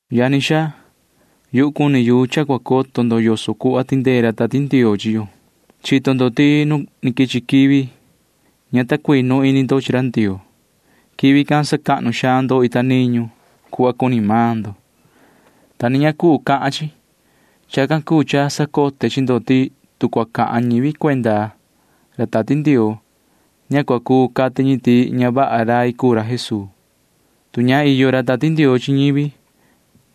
Yani xaa, yuhu cuni yu cha cua coto ndo yoso cuhva tindee ra Tati Ndioo chi yo. Chito ndo ti nu ni quichi quivi ña ta cuinu ini ndo chi ra Ndioo. Quivi can sacahnu xaan ndo ita niñu cuhva cuni maan ndo, ta ña ni cuu cahan chi. Chacan cuu cha sacote chi ndo ti tu cua cahan ñivi cuenda ra Tati Ndioo, ña cua cuu cati ñi ti ña vaha rai cuu ra Jesuu. Tu ña iyo ra Tati Ndioo chi ñivi,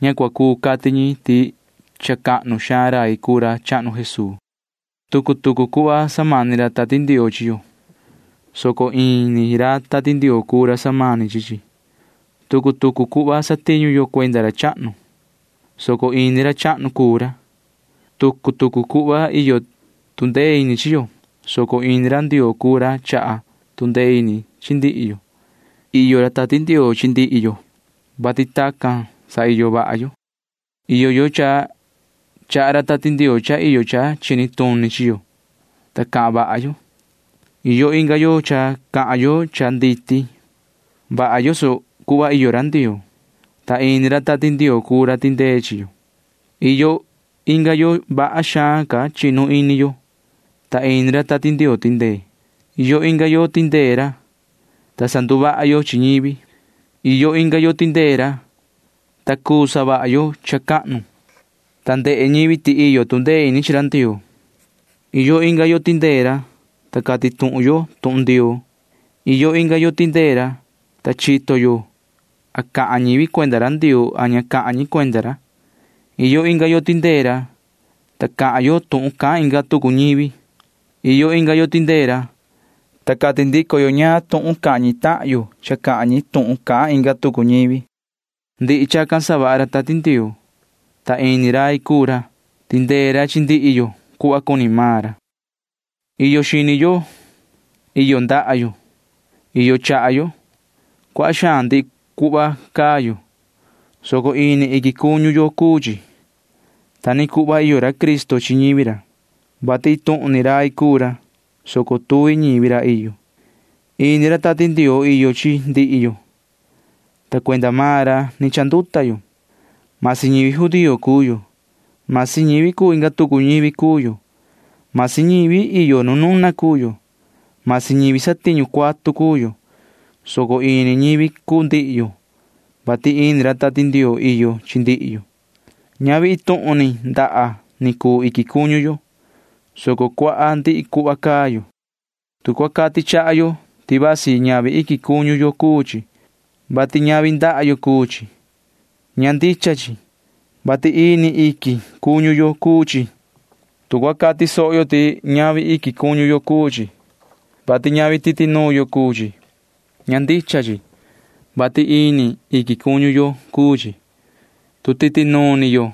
ña cua cuu cati ñi ti cha cahnu xaan rai cuu ra chahnu Jesuu. Tucu tucu cuhva samani ra Tati Ndioo chi yo, soco ini ra Tati Ndioo cuu ra samani chi chi. Tucu tucu cuhva satiñu yo cuenda ra chahnu, soco ini ra chahnu cuu ra. Tucu tucu cuhva iyo tu ndee ini chi yo, soco ini ra Ndioo cuu ra chaha tu ndee ini chi ndihi yo. Iyo ra Tati Ndioo chi ndihi yo, vati tacan sa iyo vaha yo. Iyo yo cha chaha ra Tati Ndioo cha iyo cha chini tuni chi yo, ta cahan vaha yo. Iyo inga yo cha cahan yo cha nditi vaha yoso cuhva iyo ra Ndioo, ta ini ra Tati Ndioo cuu ra tindee chi yo. Iyo inga yo vaha xaan ca chinu ini yo, ta ini ra Tati Ndioo tindee. Iyo inga yo tindee ra, ta sanduvaha yo chi ñivi. Iyo inga yo tindee ra, ta cha cuu savaha yo cha cahnu, ta ndehe ñivi ti iyo tu ndee ini chi ra Ndioo. Iyo inga yo tindee ra, ta cati tuhun yo tuhun Ndioo. Iyo inga yo tindee ra, ta chito yo a cahan ñivi cuenda ra Ndioo a ña cahan ñi cuenda ra. Iyo inga yo tindee ra, ta cahan yo tuhun cahan inga tucu ñivi. Iyo inga yo tindee ra, ta cati ndico yo ñaan tuhun cahan ñi tahan yo cha cahan ñi tuhun cahan inga tucu ñivi. Ndihi chacan savaha ra Tati Ndioo, ta ini rai cuu ra. Tindee ra chi ndihi yo cuhva cuni maan ra. Iyo xini yo. Iyo ndaha yo. Iyo chaha yo. Cuaha xaan ndihi cuhva caa yo, soco ini iquin cuñu yo cuu chi. Ta ni cuhva iyo ra Cristo chi ñivi ra, vati iin tuhun ni rai cuu ra, soco tuvi ñivi ra iyo. Ini ra Tati Ndioo iyo chi ndihi yo, ta cuenda maan ra ni chanduta yo. Masi ñivi judío cuu yo. Masi ñivi cuu inga tucu ñivi cuu yo. Masi ñivi iyo nu nuna cuu yo. Masi ñivi satiñu cuatu cuu yo, soco ini ñivi cuu ndihi yo, vati ini ra Tati Ndioo iyo chi ndihi yo. Ñavi iin tuhun ni ndaha ni cuu iquin cuñu yo, soco cuaha ndihi cuhva caa yo. Tu cua cati chaha yo ti vasi ñavi iquin cuñu yo cuu chi, vati ñavi ndaha yo cuu chi, ña ndicha chi, vati ini iquin cuñu yo cuu chi. Tu cua cati soho yo ti ñavi iquin cuñu yo cuu chi, vati ñavi titi nuun yo cuu chi, ña ndicha chi, vati ini iquin cuñu yo cuu chi. Tu titi nuun ni yo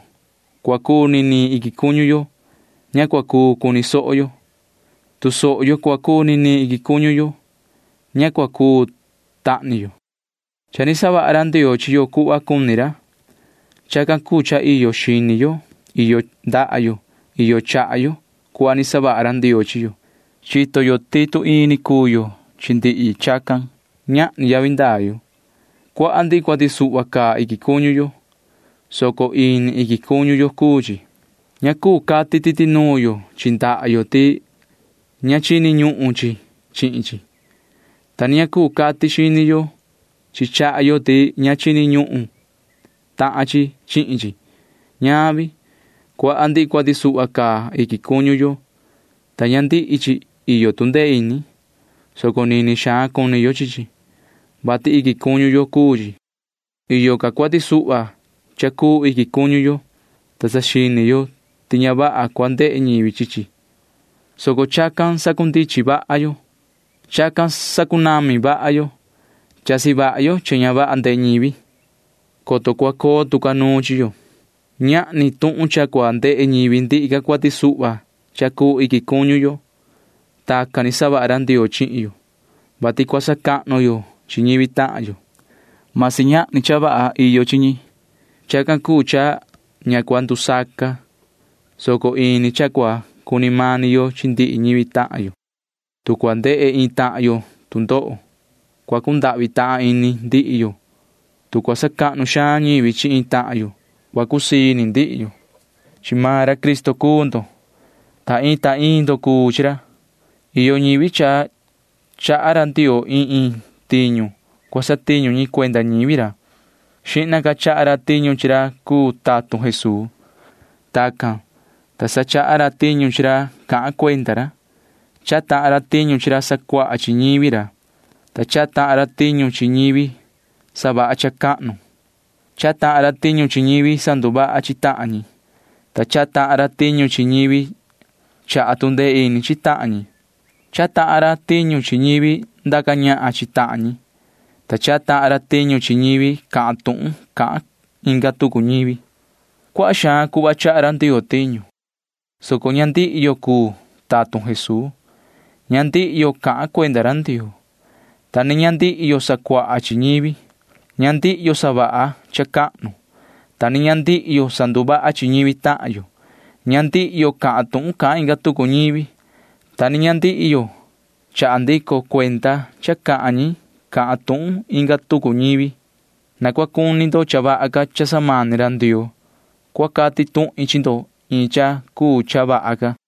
cua cuu niniin iquin cuñu yo, ña cua cuu cuni soho yo. Tu soho yo cua cuu niniin iquin cuñu yo, ña cua cuu tahni yo. Cha ni savaha ra Ndioo chi yo cuhva cuni ra. Chacan cuu cha iyo xini yo, iyo ndaha yo, iyo chaha yo cuhva ni savaha ra Ndioo chi yo. Chito yo ti tu ini cuu yo chi ndihi chacan, ñahni yavi ndaa yo. Cuaha ndihi cuati suhva caa iquin cuñu yo, soco ini iquin cuñu yo cuu chi. Ña cuu cati titi nuun yo chi ndaha yo ti ña chini ñuhun chi chihin chi, ta ni ña cuu cati xini yo chi chaha yo ti ña chini ñuhun tahan chi chihin chi. Ñavi. Cuaha ndihi cuati suhva caa iquin cuñu yo, ta ña ndihi chi iyo tu ndee ini, soco nini xaan cuni yo chi chi, vati iquin cuñu yo cuu chi. Iyo ca cuati suhva cha cuu iquin cuñu yo, ta saxini yo ti ña vaha cua ndehe ñivi chi chi, soco chacan sacundichin vaha yo. Chacan sacunami vaha yo. Chasi vaha yo cha ña vaha ndehe ñivi, [coto cua coo tu ca nuun chi yo]. Ñahni tuhun cha cua ndehe ñivi ndihi ca cuati suhva cha cuu iquin cuñu yo. Tacan ni savaha ra Ndioo chihin yo, vati cua sacahnu yo chi ñivi tahan yo―masi ñahni cha vaha iyo chi ñi. Chacan cuu cha ña cua ndusaca, soco ini cha cua cuni mani yo chi ndihi ñivi tahan yo. Tu cua ndehe iin tahan yo tu ndoho, cua cundahvi tahan ini ndihi yo. Tu cua sacahnu xaan ñivi chi iin tahan yo, cua cusii ini ndihi yo. Chi maan ra Cristo cuu ndo. Ta iin ta iin ndo cuu chi ra. Iyo ñivi cha chaha ra Ndioo iin iin tiñu cua satiñu ñi cuenda ñivi ra. Xihna ca chaha ra tiñu chi ra cuu tatun Jesuu. Tacan, ta sa chaha ra tiñu chi ra cahan cuenda ra. Chaha tahan ra tiñu chi ra sacuaha chi ñivi ra, ta chaha tahan ra tiñu chi ñivi savaha cha cahnu. Chaha tahan ra tiñu chi ñivi sanduvaha chi tahan ñi, ta chaha tahan ra tiñu chi ñivi chaha tu ndee ini chi tahan ñi. Chaha tahan ra tiñu chi ñivi ndaca ñahan chi tahan ñi, ta chaha tahan ra tiñu chi ñivi cahan tuhun cahan inga tucu ñivi. Cuaha xaan cuhva chaha ra Ndioo tiñu, soco ña ndihi yo cuu tatun Jesuu. Ña ndihi yo cahan cuenda ra Ndioo, ta ni ña ndihi yo sacuaha chi ñivi. Ña ndihi yo savaha cha cahnu, ta ni ña ndihi yo sanduvaha chi ñivi tahan yo. Ña ndihi yo cahan tuhun cahan inga tucu ñivi, ta ni ña ndihi yo chaha ndico cuenda cha cahan ñi cahan tuhun inga tucu ñivi. Na cua cuni ndo cha vaha ca cha samani ra Ndioo. Cua cati tuhin chi ndo iin cha cuu cha vaha ca.